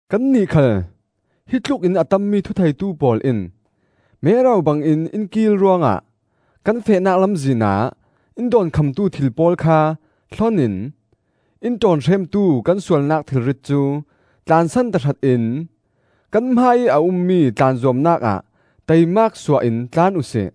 Kannih khal hitlukin a tammi thutheitu pawl in mero bangin in kiil ruangah kan fehnak lamzinah in dawnkhamtu thil pawl kha hlonin in ṭawnhremtu kan sualnak thilrit cu tlansan tahratin kan hmaiih a ummi tlanzuamnak ah taimak suah in tlan uhsi.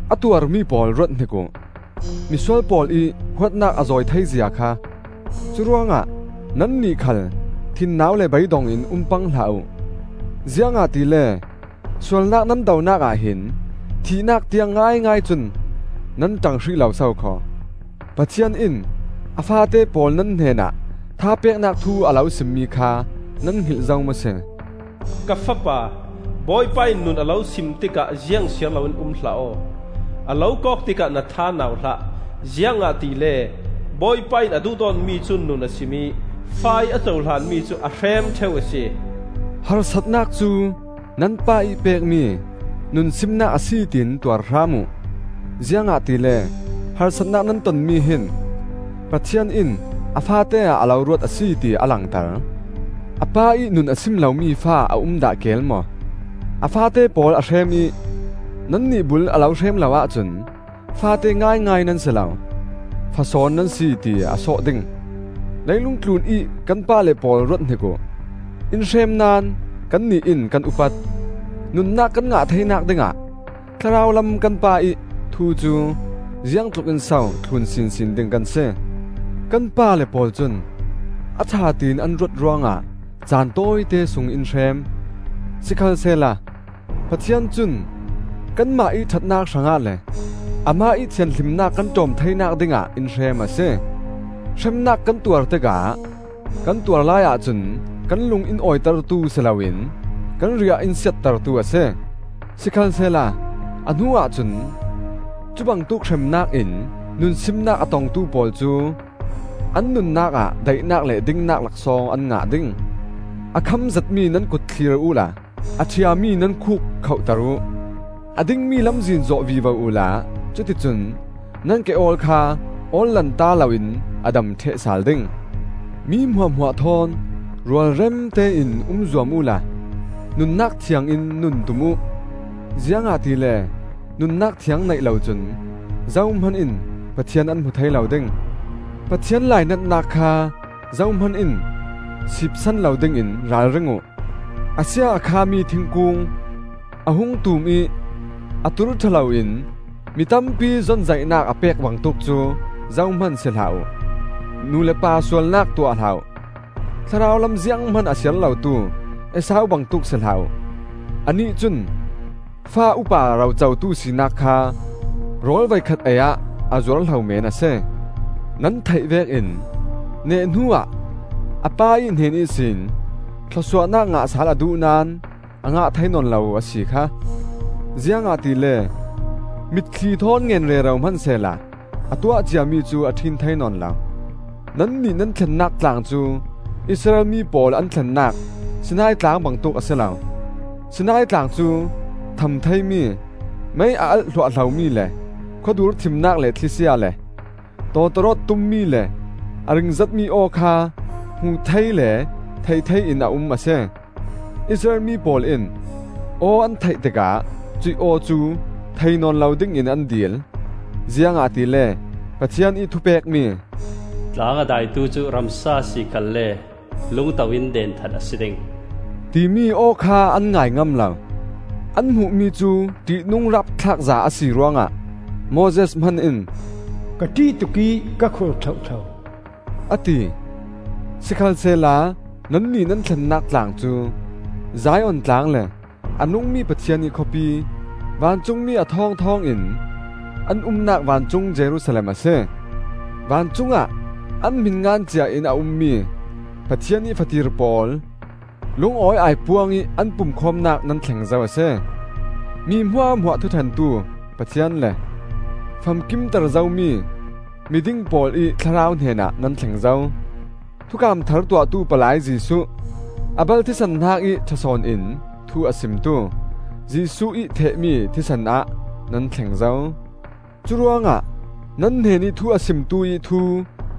A tuarmi pawl ruathnik uh! Misual pawl ih huatnak a zawi thei zia kha! Curuangah nannih khal thinnau le beidong in um pang hlah uh. Ziangahtile sualnak nan donak ah hin thihnak tiang ngaingai cun nan ṭang hrih lo sokhaw. Pathian in a faate pawl nan hnenah thapeknak thu a lo simmi kha nan hngilh zo maw si? “Ka fapa, Bawipa in nun a lo sim tikah ziang siar loin um hlah aw. A lo kawk tikah na tha nau hlah. Ziangahtile Bawipa in a duhdawtmi cu nun a sim ih, fa ih a cohlanmi cu a hrem ṭheu a si. Harsatnak cu nan pa ih pekmi nunsimnak a si tiin tuar hram uh; ziangahtile harsatnak nan tonmi hin Pathian in a faate ah a lo ruat a si ti a langter. A pa ih nun a sim lomi fa a um dah keel maw? A faate pawl a hrem ih nannih bul a lo hrem lo ahcun faate ngaingai nan si lo, fasawn nan si ti a sawh ding. Leilung tlunih kan pale pawl ruathnik uh; in hrem naón kannih in kan upat. Nunnak kan ngah theinak dingah Thlarau lam kan Pa ih thu cu ziangtluk in so thlun sinsin ding kan si? Kan pale pawl cun a ṭha tiin an ruat ruangah caan tawite sung in hrem; sikhalsehla Pathian cun kanmah ih ṭhatnak hrangah le amah ih thianhlimnak kan ṭawm theinak dingah in hrem a si. Hremnak kan tuar tikah kan tuar laiah cun kan lung in awitertu si loin kan riah in siattertu a si. Sikhalsehla a hnuah cun cubangtuk hremnak in nunsimnak a tongtu pawl cu an nunnak ah daihnak le dingnak laksawng an ngah ding. A kham zetmi nan kut thlir uhla a ṭhiami nan khuk khohter uh. A dingmi lamzin zawh vivo uhla cuticun nan ke-awl kha awl lanta loin a dam ṭheh sal ding. Mi hmuahhmuah thawn rualremte in um zuam uhla nunnak thiangin nun tum uh, ziangahtile nunnak thiang neih locun zohman in Pathian an hmu thei lo ding. Pathian lainatnak kha zohman in siipsan lo dingin ralring uh. A sia a khami thingkung, a hung tum ih a tur ṭha loin mi tampi zonzaihnak a pek bangtuk cu zohman si hlah uh. Nu le pa sualnak tuah hlah uh; thlarau lam zianghman a siar lotu Esau bangtuk si hlah uh; anih cun fa upa rocotu sinak kha rawl voikhat ei-ah a zuar hlo meen a si. Nan theih vekin neh hnuah a pa ih hnen ihsin thlawsuahnak ngah sal a duh naón a ngah thei nawn lo a si kha! Ziangahtile mitthli thawn ngen rero hmansehla a tuah ciami cu a ṭhin thei nawn lo. Nannih nan thlennak tlang cu Israel mi pawl an thlennak Sinai tlang bangtuk a si lo. Sinai tlang cu tham theimi, mei a alh hluahhlomi le khuadur thimnak le thlisia le, tawtawrawt tummi le a ringzetmi aw kha hmuh thei le theih thei in a um a si. Israel mi pawl in aw an theih tikah cuih aw cu thei nawn lo dingin an dil, ziangahtile Pathian ih thupekmi, “Tlang a daitu cu, ramsa a si khalle, lungto in denthat a si ding,” timi aw kha an ngai ngam lo. An hmuhmi cu ṭihnung rapthlakza a si ruangah Moses hman in, “Ka ṭih tuk ih ka khur thlohthlo,” a ti. Sikhalsehla nannih nan thlennak tlang cu Zion Tlang le a nungmi Pathian ih khawpi, vancungmi a thawng thawngin an umnak vancung Jerusalem a si. Vancung ah an hmin ngan cia in a ummi Pathian ih fatir pawl lungawi aipuang ih an pumkhawmnak nan thleng zo a si. Mi hmuahhmuah thuṭhentu Pathian le famkimter zomi miding pawl ih thlarau hnenah nan thleng zo. Thukam thar tuahtu palai Jesuh, Abel thisen hnakih ṭha sawn in thu a simtu, Jesuh ih thehmi thisen ah nan thleng zo. Curuangah nan hnenih thu a simtu ih thu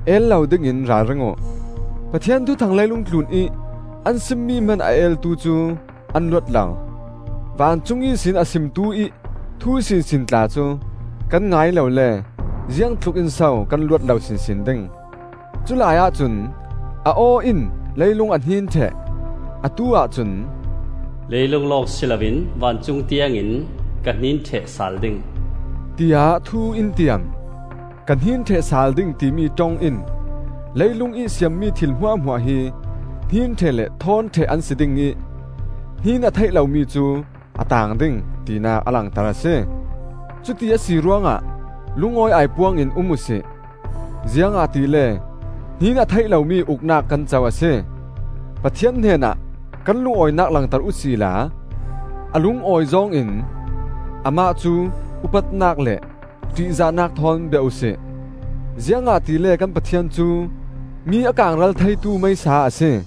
el lo dingin ralring uh. Pathian thuthang leilung tlunih an simmi hman a eltu cu an luat lo. Vancung ihsin a simtu ih thu sinsin tla cu kan ngai lo le ziangtlukin so kan luat lo sinsin ding! Culai ahcun a aw in leilung a hnin ṭheh; atu-ah cun, “Lei lung lawng si loin vancung tiangin ka hnin ṭheh sal ding,” tiah thu in tiam. “Ka hnin ṭheh sal ding,” timi ṭong in leilungih siammi thil hmuahhmuah hi hnin ṭheh le thawn ṭheh an si ding ih hnin a theih lomi cu a taang ding, tinak a langter a si. Cuti a si ruangah lungawi aipuang in um uhsi. Ziangahtile hnin a theih lomi uknak kan co a si. Pathian hnenah kan lungawinak langter uhsila a lungawi zawng in Amah cu upatnak le ṭihzahnak thawn bia uhsi. Ziangahtile kan Pathian cu mi a kaangral theitu meisa a si.